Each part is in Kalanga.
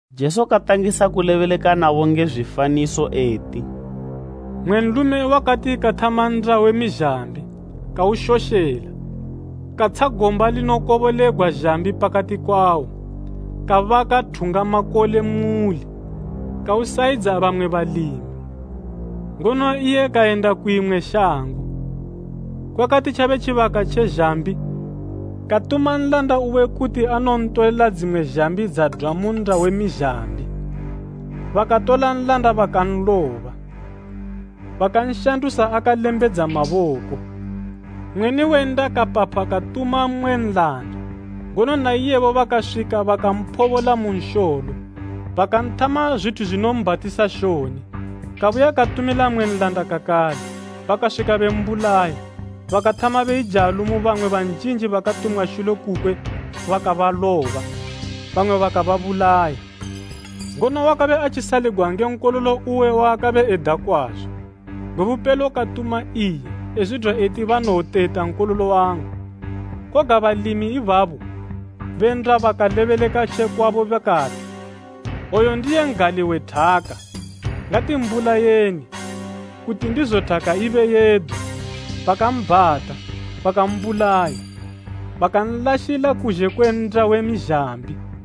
Jesu katangisa kulebeleka nabo nge zwifaniso eti, “Mmwe nlume wakati kathama nnda we mizhambi, kaushoshela, katsha gomba linokobolegwa zhambi pakati kwawo, kabaka thungamakole thungamakole: I mbako yakakula kupinda dzose. muuli, kawusayidza bamwe balimi, ngono iye kayenda ku imwe shango. Kwakati tjabe tjibaka tje zhambi, katuma nlanda uwe kuti anontolela dzimwe zhambi dzadwa mu nnda we mizhambi. Bakatola nlanda bakanloba, bakanshandusa akalembedza maboko. Mweni we nnda kapapha katuma mmwe nlanda, ngono na iyebo bakaswika bakamphobola mu nsholo, bakanthama zwithu zwinobhatisa shoni. Kabuya katumila mmwe nlanda kakale, bakaswika bembulaya, bakathama beijalo mu bamwe banjinji bakatumwa shule kukwe bakabaloba, bamwe bakababulaya. Ngono wakabe atjisaligwa nge nkololo uwe waakabe eda kwazo. Gwe bupelo katuma iye, ezwidwa eti, ‘Banowoteta nkololo wangu.’ Koga balimi ibabo be nnda bakalebeleka tje kwabo bakati, ‘Oyu ndiye n'gali we thaka, ngatimbulayeni, kuti ndizo thaka ibe yedu.’ Bakambhata, bakambulaya, bakanlashila kuzhe kwe nnda we mizhambi.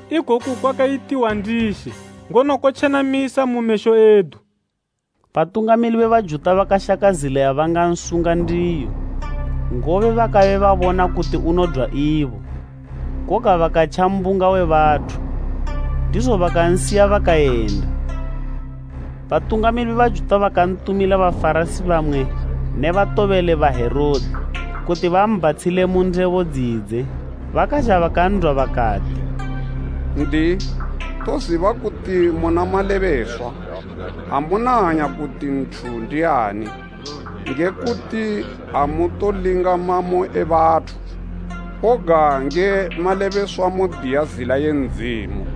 ikoku kwakayitiwa ndi She, ngono kotjenamisa mu mesho edu?’” Batungamili be Bajuta bakashaka zila yabangansunga ndiyo, ngobe bakabe babona kuti unodwa ibo, koga bakatja mbunga we bathu. Ndizo bakansiya bakayenda. Batungamili be Bajuta bakantumila Bafarasi bamwe ne batobeli ba Herode kuti bambhatshile mu ndebo dzidze. Bakazha bakan'dwa bakati, “N'diyi, toziba kuti muna malebeswa, amuna hanya kuti nthu ndiani, nge kuti amutolinga mamo e bathu, koga nge malebeswa modiya zila ye Ndzimu.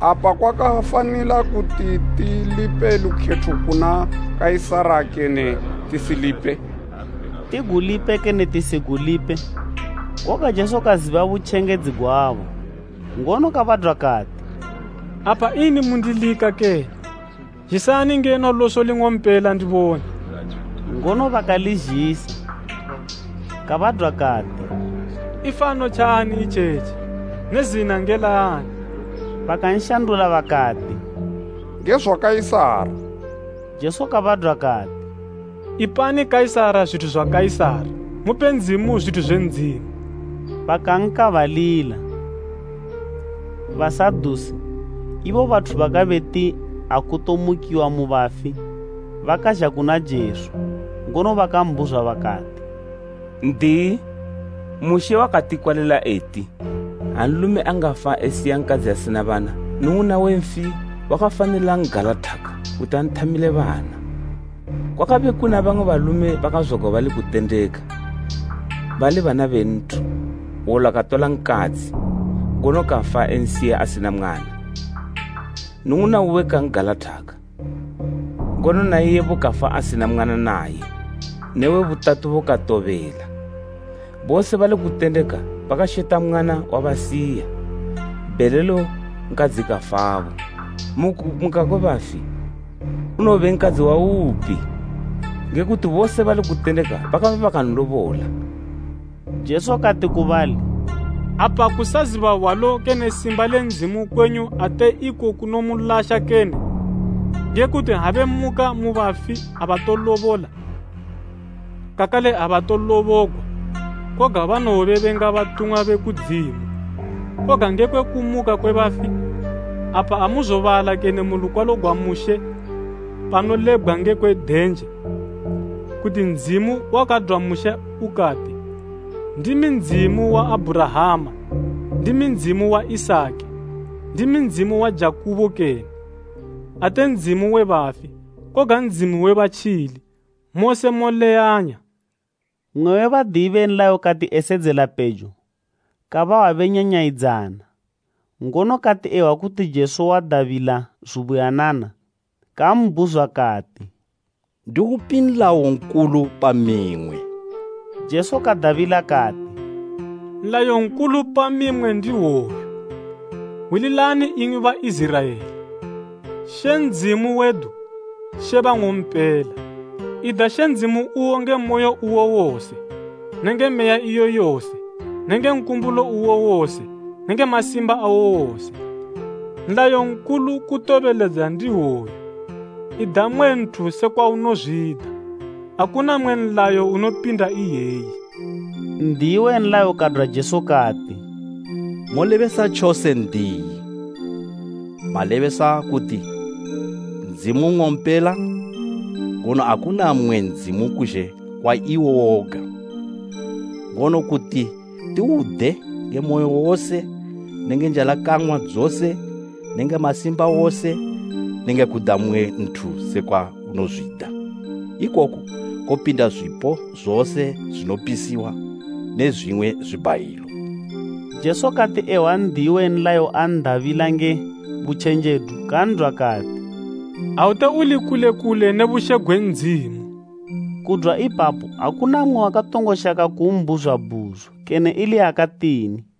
Apa kwakafanila kuti tilipe lukhetho kuna Kaisara kene tisilipe?” Tigulipe kene tisigulipe? Koga Jesu kaziba butjengedzi gwabo, ngono kabadwa kati, “Apa ini mundilika kene? Zhisani ngeno loso ling'ompela ndibone.” Ngono bakalizhisa. Kabadwa kati, “Ifano tjaani itjetji ne zina nge laani?” Bakanshandula bakati, “Nge zwa Kaisara.” Jesu kabadwa kati, “Ipani Kaisara zwithu zwa Kaisara, mupe Ndzimu zwithu zwe Ndzimu.” Bakankaabalila. Basadusi, ibo bathu bakabe beti akutomukiwa mu bafi, bakazha kuna Jesu. Ngono bakambhuzwa bakati, “N'diyi, Mushe wakatikwalila eti, ‘Ha nlume angafa esiya nkadzi asina bana, nnung'una we nfi wakafanila n'galathaka, kuti anthamile bana.’ Kwakabe kuna bamwe balume bakazwagwa bali kutendeka, bali bana be nthu. Hwola katola nkadzi, ngono kafa ensiya asina mwana. Nnung'una uwe kan'galathaka, ngono na iyebo kafa asina mwana naye ne we butatubo katobela. Bose bali kutendeka bakasheta mwana wabasiya. Bhelelo nkadzi kafabo. Mu kumuka kwe bafi, unowobe nkadzi waupi? Nge kuti bose bali kutendeka bakabe bakanlobola.” Jesu kati ku bali, “Apa kusaziba hwalo kene simba le Ndzimu kwenyu ate iko kunomulasha kene? Nge kuti ha bemuka mu bafi abatolobola, kakale abatolobogwa, koga banowobe benga batumwa be kudzimu. Koga ngekwe kumuka kwe bafi, apa amuzobala kene mu lukwalo gwa Mushe panolebgwa ngekwe denje, kuti Ndzimu wakadwa Mushe ukati, ‘Ndimi Ndzimu wa Abhurahama, ndimi Ndzimu wa Isaki, ndimi Ndzimu wa Jakubo kene?’ Ate Ndzimu we bafi, koga Ndzimu we batjili. Mose moleyanya.” Mmwe we Badiyi be nlayo kati esedzela pejo, kabahwa benyanyayidzana, ngono kati ehwa kuti Jesu wadabila zubuyanana, kambhuzwa kati, “Ndiupi nlayo nkulu pa mimwe?” Jesu kadabila kati, “Nlayo nkulu pa mimwe ndi hwoyu, ‘Hwililani imwi Baiziraela, She Ndzimu wedu, She bang'ompela. Ida She Ndzimu uwo nge moyo uwo wose nenge meya iyo yose nenge nkumbulo uwo wose nenge masimba awo wose.’ Nlayo nkulu kutobeledza ndihwoyu, ‘Ida mmwe nthu sekwa unozwida.’ Akuna mmwe nlayo unopinda iyeyi.” N'diyi we nlayo kadwa Jesu kati, “Molebesa tjose, N'diyi. Malebesa kuti Ndzimu nng'ompela, ngono akuna mmwe Ndzimu kuzhe kwa iwo woga. Ngono kuti tiwude nge moyo wose nenge njalakang'wa dzose nenge masimba wose nenge kuda mmwe nthu sekwa unozwida, ikoku kopinda zwipo zose zwinopisiwa ne zwimwe zwibhayilo.” Jesu kati ehwa N'diyi we nlayo an'dabila nge butjenjedu, kan'dwa kati, “Aute uli kule kule ne bushe gwe Ndzimu.” Kudwa ipapo akuna mmwe wakatongo shaka kumbhuzwa bhuzo kene ili yakatini.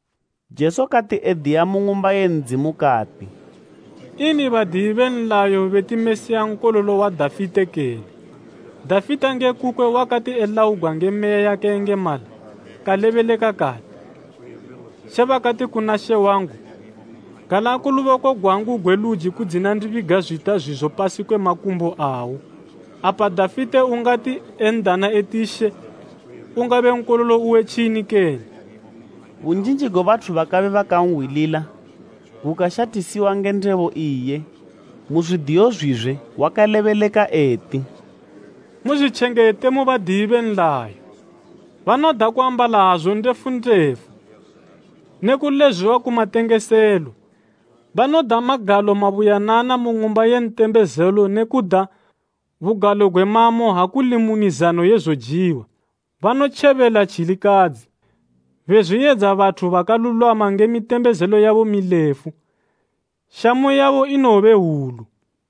Jesu kati ediya mu Ng'umba ye Ndzimu kati, “Ini badiyi be nlayo beti Mesiya nkololo wa Dafite kene? Dafite nge kukwe wakati elaugwa nge Meya yakayengemala, kalebeleka kati, “ ‘She bakati kuna She wangu, gala ku luboko gwangu gwe luji kudzina ndibiga zwita zwizo pasi kwe makumbo awo.’ “Apa Dafite ungati en'dana eti ‘She,’ ungabe nkololo uwe tjini kene?” Bunjinji gwe bathu bakabe bakanhwilila gukashathisiwa nge ndebo iye. Mu zwidiyo zwizwe wakalebeleka eti, “Muzwitjengete mu badiyi be nlayo, banoda kuambala hazu ndefu ndefu ne kulezwiwa ku matengeselo. Banoda magalo mabuyanana mu ng'umba ye ntembezelo ne kuda bugalo gwe mamo ha kuli mu mizano ye zojiwa. Banotjebela tjilikadzi, bezwiyedza bathu bakalulwama nge mitembezelo yabo milefu. Shamu yabo inowobe hwulu.”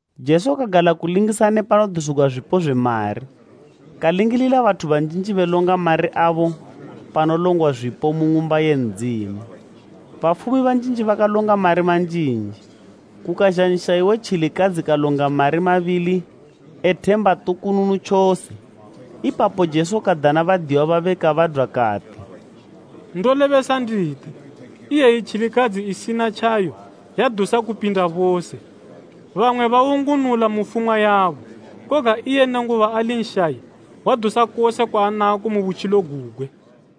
Jesu kagala kulingisana ne panodusigwa zwipo zwe mari, kalingilila bathu banjinji belonga mari abo panolongwa zwipo mu Ng'umba ye Ndzimu. Bafumi banjinji bakalonga mari manjinji. Kukazha nshayi we tjilikadzi kalonga mari mabili e themba tukununu tjose. Ipapo Jesu kadana badiyiwa babe kabadwa kati, “Ndolebesa nditi, iyeyi tjilikadzi isina tjayo, yadusa kupinda bose. Bamwe bawungunula mu fumwa yabo, koga iye nenguba ali nshayi, wadusa kose kwaanako mu butjilo gugwe.”